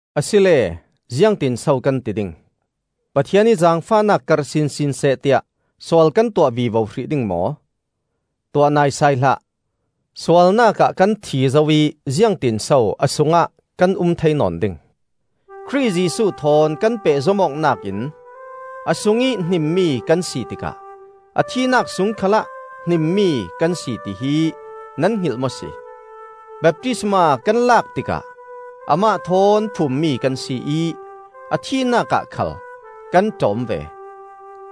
Asile ziangtinso kan ti ding? Pathian ih zaangfahnak karh sinsin seh tiah sual kan tuah vivo hrih ding maw? Tuah naisai hlah! Sualnak ah kan thi zo ih ziangtinso a sungah kan um thei nawn ding? Khrih Jesuh thawn kan pehzom awknak in a sungih hnimmi kan si tikah a thihnak sung khalah hnimmi kan si tihi nan hngilh maw si? Baptisma kan lak tikah amah thawn phummi kan si ih a thihnak ah khal kan ṭawm ve;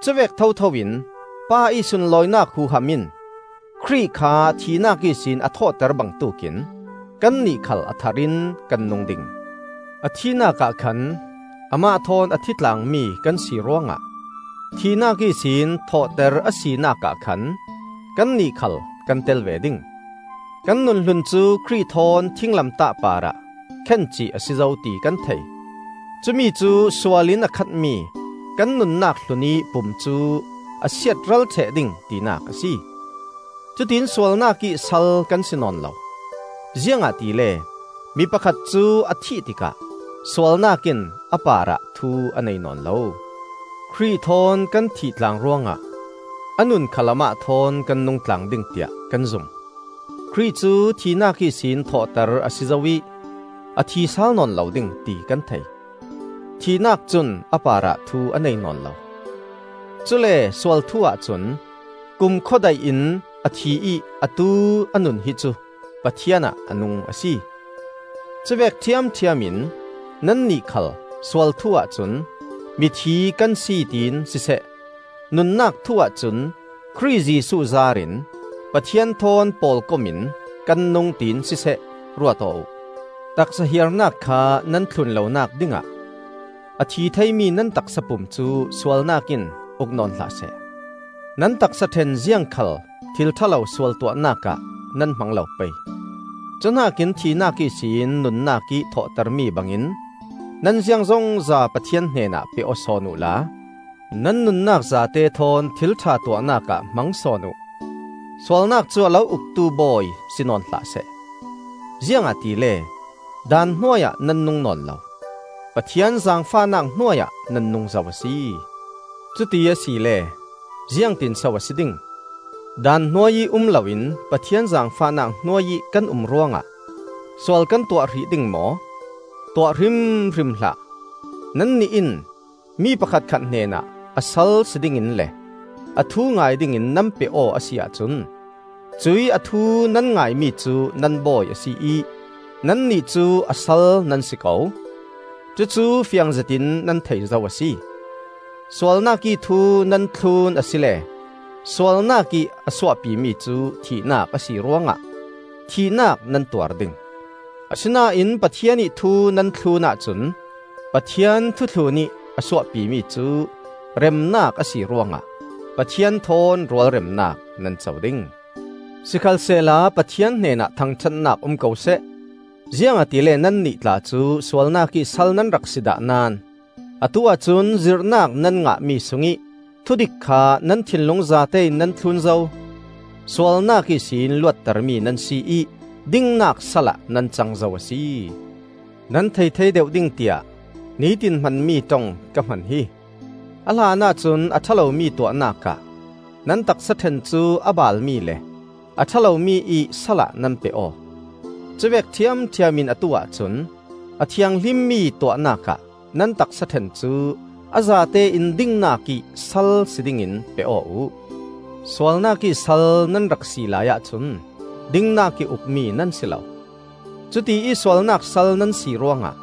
cuvek thotho in Pa ih sunlawinak huham in Khrih kha thihnak ihsin a thawhter bangtuk in kannih khal a thar in kan nung ding. A thihnak ah khan amah thawn a thi tlang mi kan si ruangah thihnak ihsin thawhter a sinakah khan kannih khal kan tel ve ding. Kan nun hlun cu Khrih thawn thinglamtah parah khencih a si zo ti kan thei; cumi cu sual in a khatmi kan nunnak hlunih pum cu a siatral ṭheh ding tinak a si. Cutiin sualnak ih sal kan si nawn lo. Ziangahtile mi pakhat cu a thih tikah sualnak in a parah thu a nei nawn lo. Khrih thawn kan thih tlang ruangah a nun khal amah thawn kan nung tlang ding tiah kan zum. Khrih cu thihnak ihsin thawhter a si zo ih a thi sal nawn lo ding, ti kan thei; thihnak cun a parah thu a nei nawn lo. Cule sual thu-ah cun kumkhua daih in a thi ih atu a nun hi cu Pathian ah a nung a si. Cuvek ṭhiamṭhiam in nannih khal sual thu-ah cun mithi kan si tiin siseh, nunnak thu-ah cun Khrih Jesuh zaar in Pathian thawn pawlkom in kan nung tiin siseh, ruat aw uh. Taksa hiarnak kha nan thlun lonak dingah a thi theimi nan taksa pum cu sualnak in uk nawn hlah seh. Nan taksaṭhen ziangkhal thil ṭha lo sual tuahnak ah nan hmang lo pei. Cuhnakin thihnak ihsin nunnak ih thawhtermi bangin nan ziangzongza Pathian hnenah pe aw sawn uhla nan nunnak zate thawn thil ṭha tuahnak ah hmang sawn uh. Sualnak cu a lo uktu bawi si nawn hlah seh; ziangahtile daan hnuai ah nan nung nawn lo, Pathian zaangfahnak hnuai ah nan nung zo a si. Cuti asile ziangtinso a si ding? Daan hnuai ih um loin Pathian zaangfahnak hnuai ih kan um ruangah sual kan tuah hrih ding maw? Tuah hrimhrim hlah! Nannih in mi pakhatkhat hnenah a sal si dingin le a thu ngai dingin nan pe aw a si ahcun, cuih a thu nan ngaimi cu nan bawi a si ih nannih cu a sal nan si ko; cucu fiang zetin nan thei zo a si. Sualnakih thu nan thlun asile sualnak ih a suahpimi cu thihnak a si ruangah thihnak nan tuar ding; asinain Pathian ih thu nan thlun ahcun Pathian thu thlunih a suahpimi cu remnak a si ruangah Pathian thawn rualremnak nan co ding. Sikhalsehla Pathian hnenah thangṭhatnak um ko seh! Ziangahtile nannih tla cu sualnak ih sal nan rak si dah naón atu-ah cun zirhnak nan ngahmi sungih thudik kha nan thinlung zatein nan thlun zo. Sualnak ihsin luattermi nan si ih dingnak salah nan cang zo a si. (Nan thei thei deuh ding tiah nitin hmanmi ṭong ka hman hi!) A hlanah cun a ṭha lomi tuahnak ah nan taksaṭhen cu a baalmi le a ṭha lomi ih salah nan pe aw. Cuvek ṭhiamṭhiam in atu-ah cun a thianghlimmi tuahnak ah nan taksaṭhen cu a zatein dingnak ih sal si dingin pe aw uh. Sualnak ih sal nan rak si laiah cun dingnak ih ukmi nan si lo. Cutiih sualnak sal nan si ruangah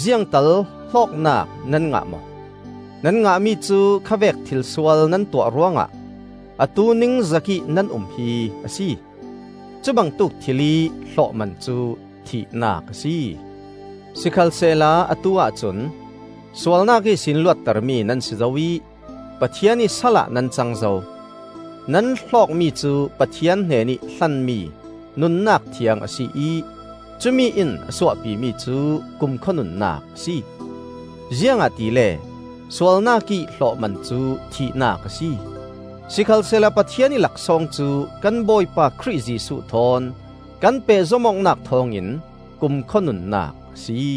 ziangtal hlawknak nan ngah maw? Nan ngahmi cu kha vek thil sual nan tuah ruangah atu ningzakih nan um hi a si. Cubangtuk thil ih hlawhman cu thihnak a si! Sikhalsehla atu-ah cun sualnak ihsin luattermi nan si zo ih Pathian ih salah nan cang zo. Nan hlawkmi cu Pathian hnenih hlanmi nunnak thiang a si ih cumi in a suahpimi cu kumkhua nunnak a si. Ziangahtile sualnak ih hlawhman cu thihnak a si; sikhalsehla Pathian ih laksawng cu kan Bawipa Khrih Jesuh thawn kan pehzom awknak thawngin kumkhua nunnak a si.